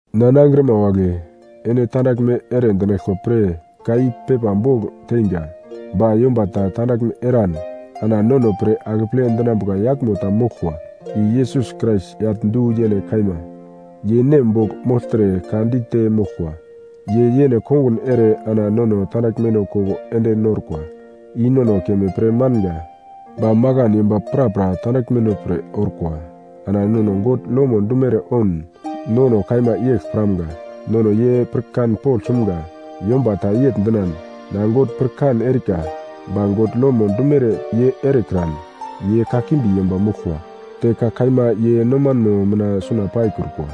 Na nangrima wagle, ene tandaglme ere dinaglkwa pre ka i pepa bogl teinga. Ba yomba ta tandaglme eran, ana nono pre akeple dinambuka yaglmo ta moglkwa, i Yesus Krais yagl du-yene kaima, ye Nem bogl mogltre ka dite moglkwa. Ye yene kongun ere ana nono tandaglmeno koko ende norkwa, i nono keme pre manga. Ba makan yomba prapra tandaglmeno pre orkwa. Ana nono God lomo dumere oun, nono kaima yegl piramga; nono ye pirkan pogl sumga. Yomba ta yegl dinan, “Na God pirkan erika,” ba God lomo dumere ye erekran, ye kakimbi yomba moglkwa, te ka kaima ye nomanmo mina suna paikrukwa.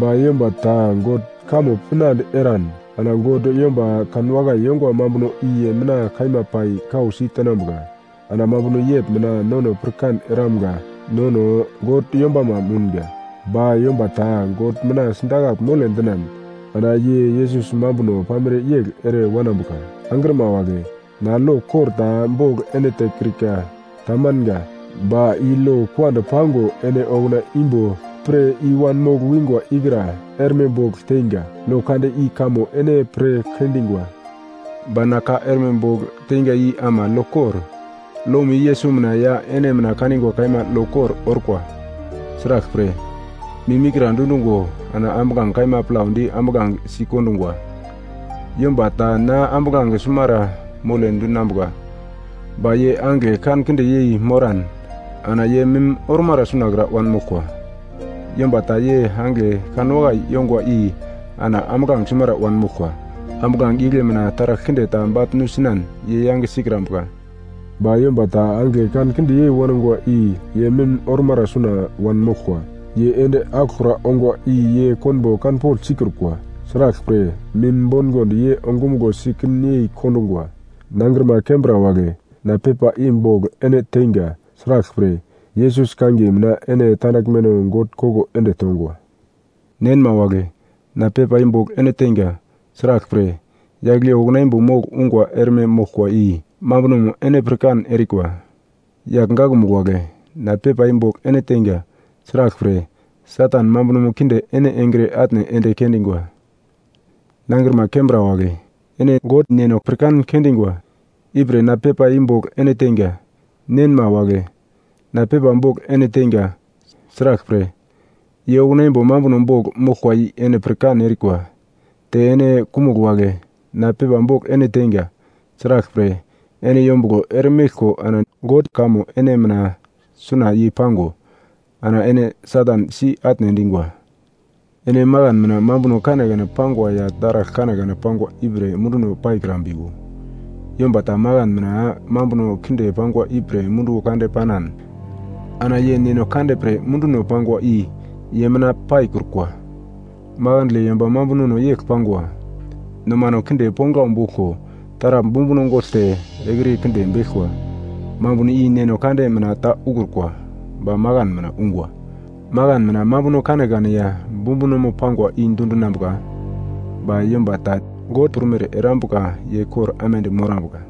Ba yomba ta God kamo pinande eran, ana God yomba kanwakai yongwa mambuno i ye mina kaima pai kausi tenambuka. Ana mambuno yegl mina nono pirkan eramga nono God yombamo mounga. Ba yomba ta God mina sidakagl mole dinan, ana ye Yesus mambuno pamere yegl ere wanambuka. Angrima wagle, na lo kor ta bogl ene tekrika. Tamanga. Ba i lo kuand pango ene okuna imbo pir i-wanmogl wingwa ikra erme bogl teinga. Lo kande i kamo ene pir kendingwa. Ba na ka erme bogl teinga i ama lo kor. Lomo i Yesus mina ya ene mina kanigwa kaima lo kor orkwa. Sraglpre, mim ikra dundungo ana ambuglange kaima plaudi ambuglange sikondungwa. Yomba ta na ambuglange sumara mole dinambuka, ba ye angigle kankinde yei moran ana ye mim ormara sunakra wanmoglkwa. Yomba ta ye angigle kanwakai yongwa i ana ambuglange sumara wanmoglkwa. Ambuglange igle mina taragl kinde ta bagl nusinan ye yange sikrambuka. Ba yomba ta angigle kankinde yei wangwa i ye mim ormara suna wanmoglkwa. Ye ende aglokra ongwa i ye konbo kanpogl sikrukwa. Sraglpre, mim bongond ye ongumuglo si kin yei kondungwa. Nangrima kembra wagle, na pepa i bogl ene teinga. Sraglpre, Yesus kangiye mina ene tandaglmeno God koko ende tongwa. Nenma wagle, na pepa i bogl ene teinga. Sraglpre, yagl i okuna imbo mogl ungwa erme moglkwa i mambunomo ene pirkan erikwa. Yagl gakmugl wagle, na pepa i bogl ene teinga. Sraglpre, Satan mambunomo kinde ene engre atne ende kendingwa. Nangrima kembra wagle, ene God Neno pirkan kendingwa. Ipre na pepa i bogl ene teinga. Nenma wagle, na pepa bogl ene teinga. Sraglpre, ye okuna imbo mambuno bogl moglkwa i ene pirkan erikwa. Te ene kumugl wagle, na pepa bogl ene teinga. Sraglpre, ene yombuglo eremeglko ana God kamo ene mina suna yei-pango, ana ene Satan si-atne endingwa. Ene makan mina mambuno kanekane pangwa ya taragl kanekane pangwa ipre munduno paikrambiwo. Yomba ta makan mina mambuno kinde pangwa ipre munduwo kande panan ana ye Neno Kande pre munduno pangwa i ye mina paikrukwa. Makandle yomba mambunono yegl pangwa: Nomano kinde ponglau boglko, taragl bumbuno gogl te ekriye kinde beglkwa. Mambuno i Neno Kande mina ta ukrukwa, ba makan mina ungwa. Makan mina mambuno kanekane ya bumbunomo pangwa i dundinambuka, ba yomba ta God prumere erambuka ye kor aimande morambuka.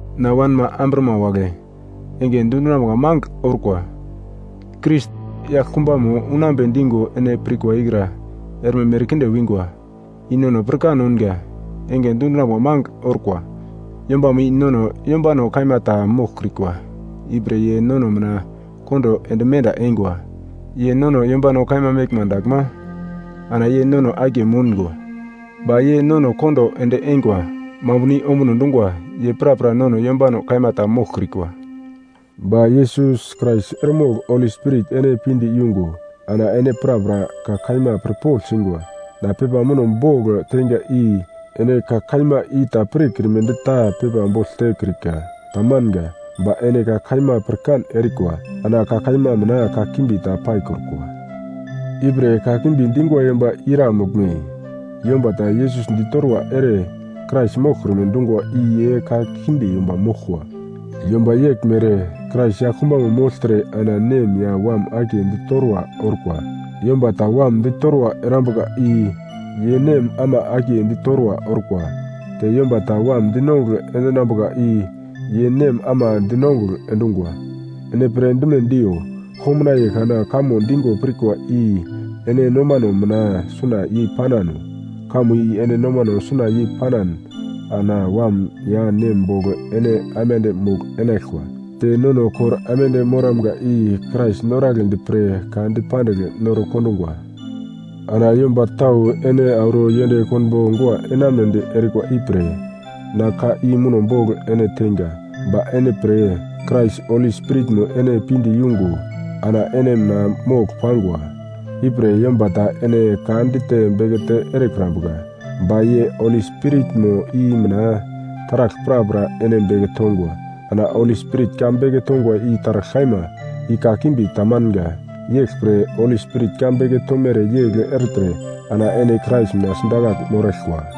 Na wanma amburama wagle, enge dundinambuka mangigl orkwa. Krais yaglkumbamo unambe digo ene pirkwa ikra erme merkinde winga. I nono pirkan ounga, enge dundinambuka mangigl orkwa. Yombamo i nono yombano kaima ta moglkrikwa, ipre ye nono mina kondo ende menda eingwa. Ye nono yombano kaima meglma daglma ana ye nono akiye moungo. Ba ye nono kondo ende eingwa mambuno i ombuno dungwa ye prapra nono yombano kaima ta moglkrikwa. Ba Yesus Krais eremogl Holi Spirit ene pinde yungo ana ene prapra ka kaima pirpogl singwa. Na pepa muno bogl teinga i ene ka kaima i ta pirkrimedi ta pepa bogl tekrika, tamanga. Ba ene ka kaima pirkan erikwa, ana ka kaima mina kakimbi ta paikrukwa. Ipre kakimbi dingwa yomba ira moglme? Yomba ta Yesus ditorwa ere Krais moglkrume dungwa i ye kakimbi yomba moglkwa. Yomba yeglmere Krais yaglkumbamo mogltre ana nem ya Wam akiye ditorwa orkwa. Yomba ta Wam ditorwa erambuka i ye Nem ama akiye ditorwa orkwa. Te yomba ta Wam dinongugl endinambuka i ye Nem ama dinongugl endungwa. Ene pirdime diyo, komnaiye kana kamo digo pirkwa i ene nomano mina suna yei-panano. Kamo i ene nomano suna yei panan ana Wam ya Nem bogl ene aimande mogl-enaglkwa. Te nono kor aimande moramga i Krais noragledi pre ka dipandigl noro kondungwa. Ana yomba tau ene auro yend konbo gua enamunedi erikwa ipre na ka i muno bogl ene teinga. Ba ene pre Krais Holi Spiritmo ene pinde yungo ana ene mina mogl pangwa, ipre yomba ta ene ka dite bekete erekrambuka. Ba ye Holi Spiritmo i mina taragl prapra ene beke tongwa. Ana Holi Spirit ka beke tongwa i taragl kaima, i kakimbi tamanga. Yeglpre Holi Spirit ka beke tomere yegl ertre ana ene Krais mina sidakagl moraglkwa.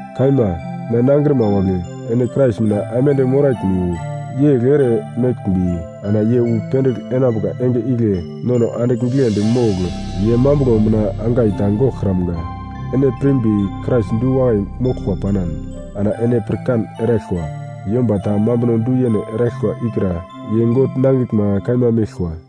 Kaima, na nangrima wagle, ene Krais mina aimande moraglmiwo. Yegl ere meglmbi ana ye wu pendigl enambuka enge igle nono andigl giglendi mogl ye mambuglo mina angai ta goglkramga. Ene pirmbi Krais du-wakai moglkwa panan, ana ene pirkan eraglkwa, yomba ta mambuno du-yene eraglkwa ikra ye God nangiglma kaima meglkwa.